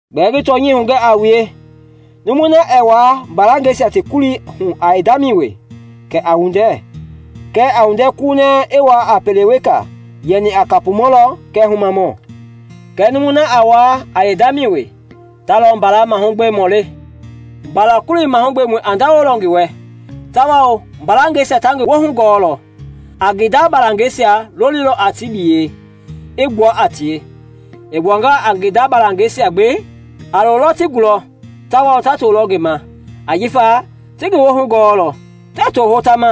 “Gbɛɛ ngi tɔnyɛi hugɛ a wue, numui na ɛɛ wuaa mbalangɛisia ti kulii hu a yeendamɛi wee, kɛɛ a windɛ kunɛ i wuaa a pele weka yɛni a kapumɔ lɔ kɛɛ humamɔ. Kɛɛ numui na a wuaa a yeendamɛi wee, ta lɔ mbala mahugbemɔi le. Mbala-kulii mahugbemɔi a ndawolɔ ngi wɛ tawao mbalangɛisia ta ngi woohu gɔɔlɔ. A ngi nda balangɛisia lolilɔ a ti biyɛi, i gbua a tie. I gbuangaa a ngi nda balangɛisia gbi, a loolɔ ti gulɔ tawao ta toolɔ ngi ma ajifa ti ngi woohu gɔɔlɔ. Tɛɛ too hota ma,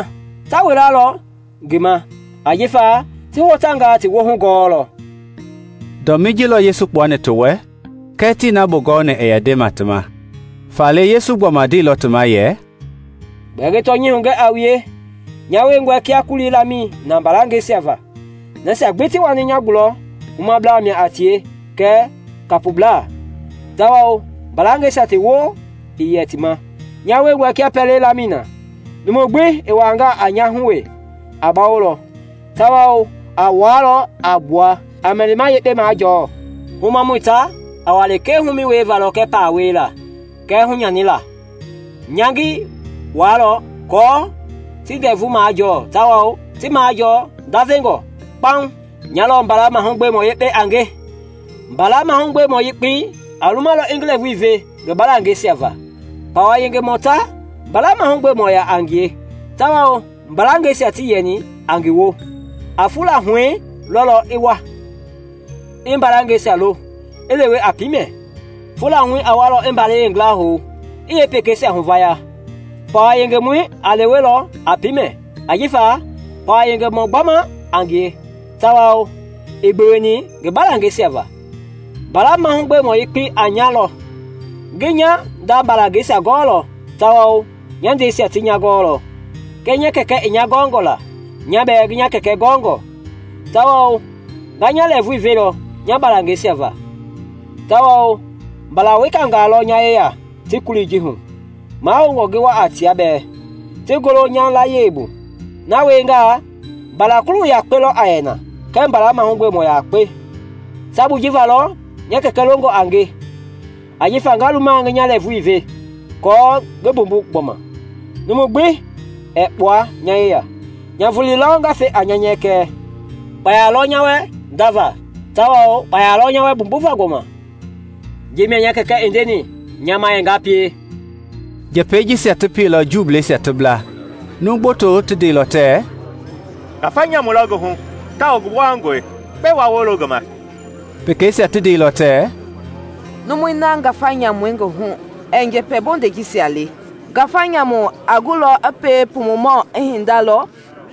ta wilalɔ ngi ma ajifa ti hotangaa ti woohu gɔɔlɔ.” Dɔmii ji lɔ Yesu i kpuani ti wɛ kɛɛ tii na bugɔni i yɛ nde ti ma. Faale, Yesu i gbɔma ndeilɔ ti ma yɛ, “Gbɛɛ ngi tɔnyɛi hugɛ a wue, nya wiengɔe kia kulii lamɛi na mbalangɛisia va. Nasia gbi ti wani nya gulɔ humablaa mia a tie kɛɛ kapublaa; tawao mbalangɛisia ti woo ii yɛ ti ma. Nya wiengɔe kia pɛlei lamɛi na; numu gbi i wuaangaa a nya hu wee, a bawolɔ tawao a wuaalɔ a gbua, a mɛlima yekpe majɔɔ. Humamɔi ta a wa lekee humɛi wieva lɔ kɛɛ paa wiela kɛɛ hunyanila; nya ngi waalɔ aako ti ndɛvu majɔɔ tawao ti majɔɔ ndavengɔ kpauŋ. “Nya lɔ mbala mahugbemɔ yekpei a nge. Mbala mahugbemɔ yekpei a lumalɔ i ngi lɛɛvui ve ngi balangɛisia va. Pawa yengemɔi ta mbala mahugbemɔi yaa a ngie tawao mbalangɛisia tii yɛni a ngi woo; a fula huɛi lɔlɔ a wa, i mbalangɛisia lo, i lewe a piimɛ. Fula huɛi a walɔ i mbalɛi yeengila hou, i yeepekeisia huvaya. Pawa yengemɔi a lewelɔ a piimɛ ajifa pawa yengemɔ gbama a ngie tawao ii gbeweni gbi mbalangɛisia va. Mbala mahugbemɔ yekpei a nya lɔ; ngi nya nda balangɛisia gɔɔlɔ tawao nya ndɛisia ti nya gɔɔlɔ, kia nya Kɛkɛi i nya gɔngɔ la, nya bɛɛ ngi nya Kɛkɛi gɔɔngɔ; tawao nga nya lɛɛvui velɔ nya balangɛisia va. Tawao mbala wekangaa lɔ nya yeya tii kulii ji hu; mahoungɔ ngi wa a tia bɛɛ, ti golo nya layie bu. Na wiengaa, mbala-gulu yakpe lɔ a yɛ na kɛɛ mbala mahugbemɔ yakpe. “Sabui ji va lɔ nya Kɛkɛi longɔ a nge ajifa nga luma ngi nya lɛɛvui ve, aako ngi mbumbu gbɔma. Numu gbi ɛɛ kpua nya yeya, nya vulii lɔ nga fe a nya nyɛkɛ. Kpaya lɔ nya wɛ ndava tawao kpaya lɔ nya wɛ mbumbuva gbɔma. Ji mia nya Kɛkɛ i ndenga nya ma yɛ ngi pie.” Njɛpɛi jisia ti pieilɔ Juuisia ti bla. Numu gboto ti ndeilɔ tɛɛ, “Ngafa nyamu lɔ ngi hu tawao ngi gbowangɔe; gbɛe wa wolo ngi ma?” Pekeisia ti ndeilɔ tɛɛ, “Numui na ngafa nyamu i ngi hu ɛɛ njɛpɛ bondei jisia le. Ngafa nyamu a gulɔ i pie pumumɔ i hinda lɔ?”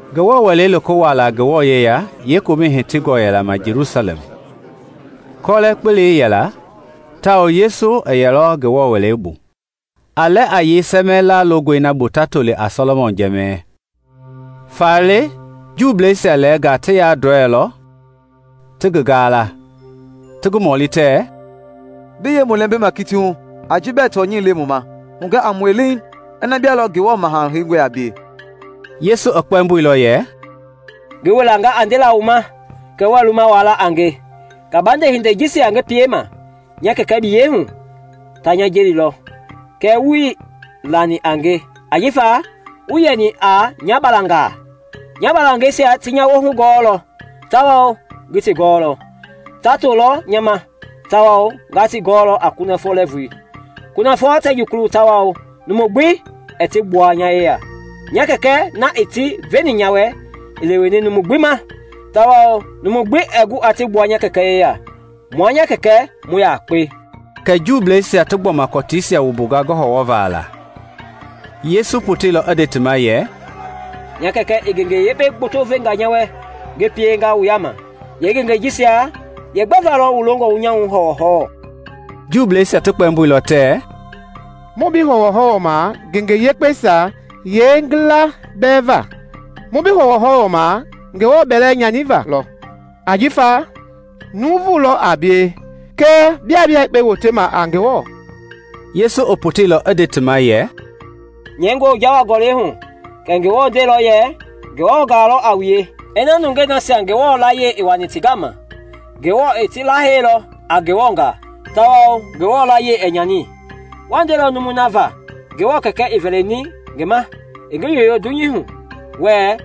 Ngewɔ Wɛlei loko wuaala Ngewɔ yeya yeekomɛi i hitiilɔ ma Jelusalɛm; kɔlɛ-kpelei yɛla tawao Yesu i yɛlɔ Ngewɔ Wɛlei bu, a lɛ a yei sɛmɛɛ laalongɔi na bu ta toli a Sɔlɔmɔn Jɛmɛi. Faale Juuisia lɛɛnga ti yandɔɛilɔ ti ngi gaala, ti ngi mɔli tɛɛ, “Bi yee mu lɛmbima kiti hu a ji bɛɛ tɔnyɛi le mu ma? Hugɛ a mue leeŋ ina bia lɔ Ngewɔ Maha Heingɔi a bie.” Yesu i kpɛmboilɔ yɛ, “Ngi wilanga a ndela wu ma kɛɛ wɛi luma wua la a nge. Kabande hindei jisia ngi piema nya Kɛkɛ biyɛi hu, ta nya jelilɔ; kɛɛ wuii lani a nge ajifa wuii yɛni a nya balangaa. Nya balangɛisia ti nya woohu gɔɔlɔ tawao ngi ti gɔɔlɔ; ta tolɔ nya ma, tawao nga ti gɔlɔ a kunafɔ lɛɛvui. Kunafɔ tɛ jukulu tawao numu gbi ɛɛ ti gbua nya yeya. Nya Kɛkɛ na i ti veni nya wɛ i leweni numu gbi ma tawao numu gbi ɛɛ gu aa ti gbua nya Kɛkɛ yeya. Mua nya Kɛkɛ mu yakpe.” Kɛ Juuisia ti gbɔma kɔtiisia wumbunga ngi hɔwɔhɔwɔva la. Yesu i poteilɔ i nde ti ma yɛ, “Nya Kɛkɛ i ngenge yekpe gboto venga nya wɛ ngi pienga wu yaama; yeengengei jisia yeegbɛ va lɔ wu longɔ wu nya hɔwɔhɔwɔ?” Juuisia ti kpɛmboilɔ tɛɛ, “Muii bi hɔwɔhɔwɔma ngenge yekpeisia yeengila bɛɛ va; mu bi hɔwɔhɔwɔma Ngewɔ bɛlɛ nyaniva lɔ! Ajifa nuuvulɔ a bie kɛɛ biaa bia yekpe wotema a Ngewɔ.” Yesu i poteilɔ i nde ti ma yɛ, “Nyɛingɔi wu jawa gɔlɛi hu kɛ Ngewɔ ndeilɔ yɛ, ‘Ngewɔngaa lɔ a wue.’ Ina nungei nasia Ngewɔ layie i wani ti gama Ngewɔ i ti laheilɔ a Ngewɔngaa (tawao Ngewɔ layie ɛɛ nyani,) wa ndelɔ numui na va Ngewɔ Kɛkɛi i vɛlini ngi ma i ngi yoyoo dunyei hu wɛɛ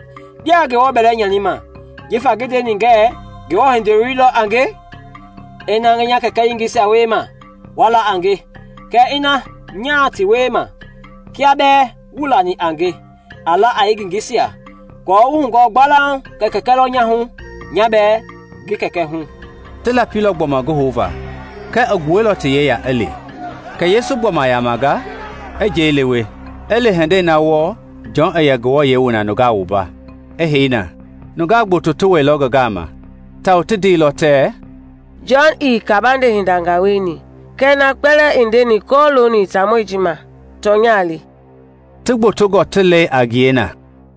‘Biaa Ngewɔ bɛlɛ nyanima’ jifa ngi ndeni ngɛɛ ‘Ngewɔ Hindoloi lɔ a nge?’ Ina ngii nya Kɛkɛ yengeisia wiema kɛ waa la a nge, Kɛɛ ina nyaa ti wiema, kia bɛɛ wuii lani a nge, a la a yeengengeisia, aako wu hugɔɔ gbalauŋ kɛ kɛkɛi lɔ nya hu, nya bɛɛ ngi Kɛkɛi hu.” Ti lapilɔ gbɔma ngi houva kɛɛ i gbuailɔ ti yeya i li. Kɛ Yesu i gbɔma yamanga, i njɛi lewe, i li hindei wɔɔ Jɔn i yɛ nungaa wua na, i hei na. Nungaa gboto ti wɛilɔ ngi gama, tawao ti ndeilɔ tɛɛ, “Jɔn ii kabande hindangaa wieni kɛɛ na kpɛlɛɛ i ndeni kɔlooni taamɔi ji ma tɔnya le.” Ti gbotongɔ ti leilɔ a ngie na.